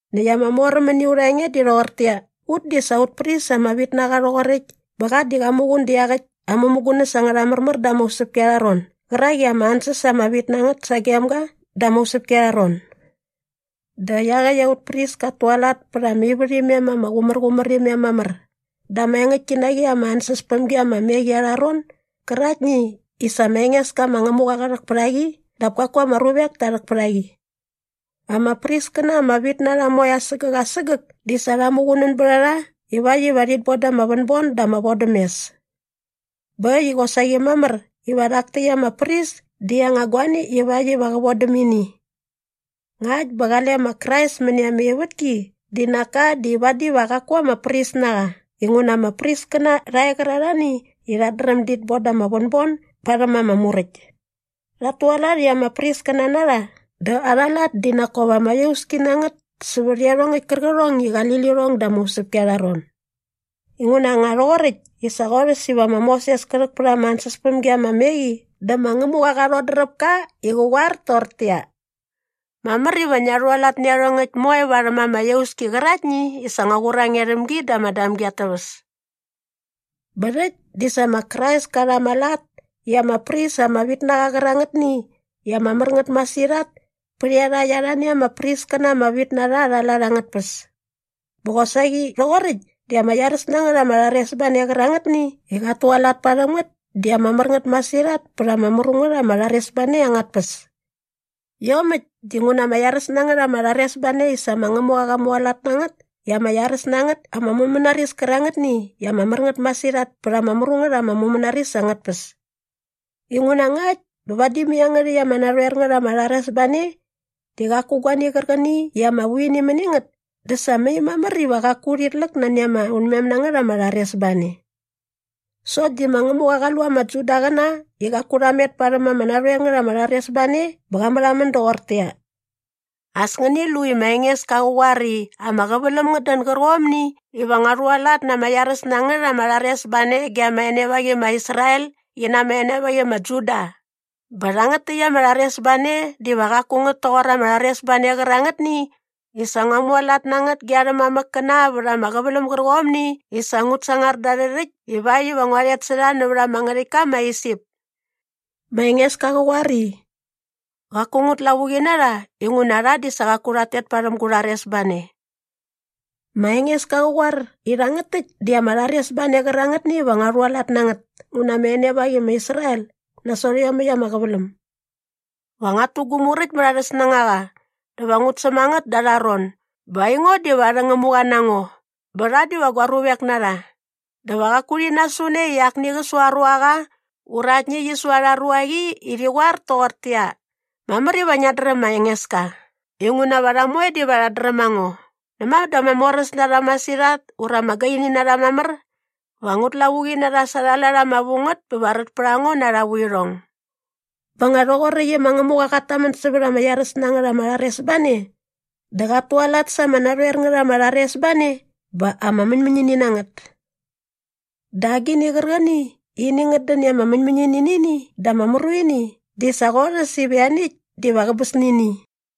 Näkt ama moräm mäni aurha enge di rhoqortäqyia, ut di sa aut pris ama vit na qa rhoqoräkt bä qa di qat muqun dä iaqäkt aa mämugunäs angärha märmär da ama usäpki arha ron gärak i ama ansäs ama vit na ngät sagem ga da ama usäpki arha ron. Dä iaqäkt aut pris kat tualat pät ama ivärhimem ama qumärqumär imem mamär da ama engäktki na qi ama ansäspämgi ama me qi arha ron gäraktni i sa ma Engeska ma Ngämuqa qa rhäk pät a qi dap kaku ama ruvek ta rhäk pät a qi. Ama priskäna ama vit na rha moe asägäk asägäk di sa rha muqunän bät a rha ivakt iva rhit boda ama vänbon dä ama vodämes. Bä äkt i qosaqi mamär iva rhak täkt ama pris di aa anga guani ivakt iva qä vodäm ini. Ngakt bä qale ma Krais mäni ama ivätki di nak ka di vadi va qaku ama pris na qa inguna ama priskäna rha e qärarhani i rhat dräm dit boda ama vänbon barhäm ama Muräkt. Rhat tualat i ama priskäna na rha dä arha lat di nak kop ama iauski na ngät sävät iarhongäkt kärqärhong i qali lirhong da ama usäpki arha ron. Inguna nga rhoqoräkt i sa qorhäs iva ma Moses kä rhäk pät ama ansäspämgi ama me qi dä ma Ngämuqa qa rhodräp ka i qä qoar toqortäqyia, “Mamär iva ngia rhualat nä iarhongäkt moe varhäm ama iauski qäraktni i sa ngua qur a nge rhäm gi da ama damgi at täväs.” Bä rhäkt di sa ma Krais ka rha ama lat i ama pris ama vit na qa qärangätni i ama mär ngät masirhat pät iarhakt arhani ama priskäna ama vit na rha arha lat angät tpäs. Bä qosaqi rhoqoräkt di ama iaräs na ngät ama rharesbane qärangätni i qat tualat parhäm ngät di ama mär ngät masirhat pät ama mru ngät ama rharesbane angät tpäs. Iomäkt dinguna ama iaräs na ngät ama rharesbane di sa ma Ngämuqa qa mualat na ngät na ama iaräs na ngät ama mumänaris kärangätni i ama mär ngät masirhat pät ama mru ngät ama mumänaris angät tpäs. Inguna ngakt bä vadi mai iangärhäkt ama narhoer ngät ama rharesbane di qaku guani qärqäni i ama vu ini mäni ngät dä sa mai mamär iva qaku urhit läk nani ama unmem na ngät ama rharesbane. Sokt di ma Ngämuqa qa lu ama Judaqäna i qaku rha met parhäm ama narhoer ngät ama rharesbane bä qa märhamän doqortäqyia, “As ngäni lu i ma Engeska qä qoar i ama qäväläm ngät dän gärqomni iva ngua rhualat na ama iaräs na ngät ama rharesbane ge ama enevaqi i ma Israel qi na ama enevaqi i ma Juda bä rhangät täkt ama rharesbane diva qaku ngät toqor ama rharesbane qärangätni i sa ngua mualat na ngät ge arhä mamäkkäna vät ama qäväläm gärqomni i sa ngut sangar da arhä rhäkt ivakt iva ngua rhet sä rha nävät ama ngärhäktka ma Isip.” Ma Engeska qä qoar i, “Qaku ngut lavuqi na rha inguna rha di sa qaku rhat tet parhäm gu rharesbane.” Ma Engeska qä qoar i rhangät täkt di ama rharesbane qärangätni iva ngua rhualat na ngät ngu na ama enevaqi i ma Israel nasot iomäkt ama qäväläm. “Va nguat tu gu muräkt mät arhä snängaqa dä va ngut säm a ngät da arha ron bä aingo diva arhä Ngämuqa na ngo bä rha diva gua ruvek na rha. Dä va qaku rhi nasu ne i akni qä su aa ruaqa ura aktni qi su arha ruaqi i rhi qoar toqortäqyia, ‘Mamär iva ngiat dräm ma Engeska’ inguna va rha moe diva rhat dräm a ngo näma dä ama moräs na rha masirhat ura ama gaini na rha mamär. Va ngut lavuqi na rha sa arha lat ama vu ngät bä va rät pät a ngo na arha vuirhong.” Bä nga rhoqoräkt i ma Ngämuqa qat tamän sävät ama iaräs na ngät ama rharesbane dä qat tualat sa ama narhoer ngät ama rharesbane bä ama mäñmäñini na ngät. Dä agini qärqäni i ini ngät dän i ama mäñmäñini nä ini dä ama mru ini di sa qorhäs iva ianiäkt diva qäbäs nä ini.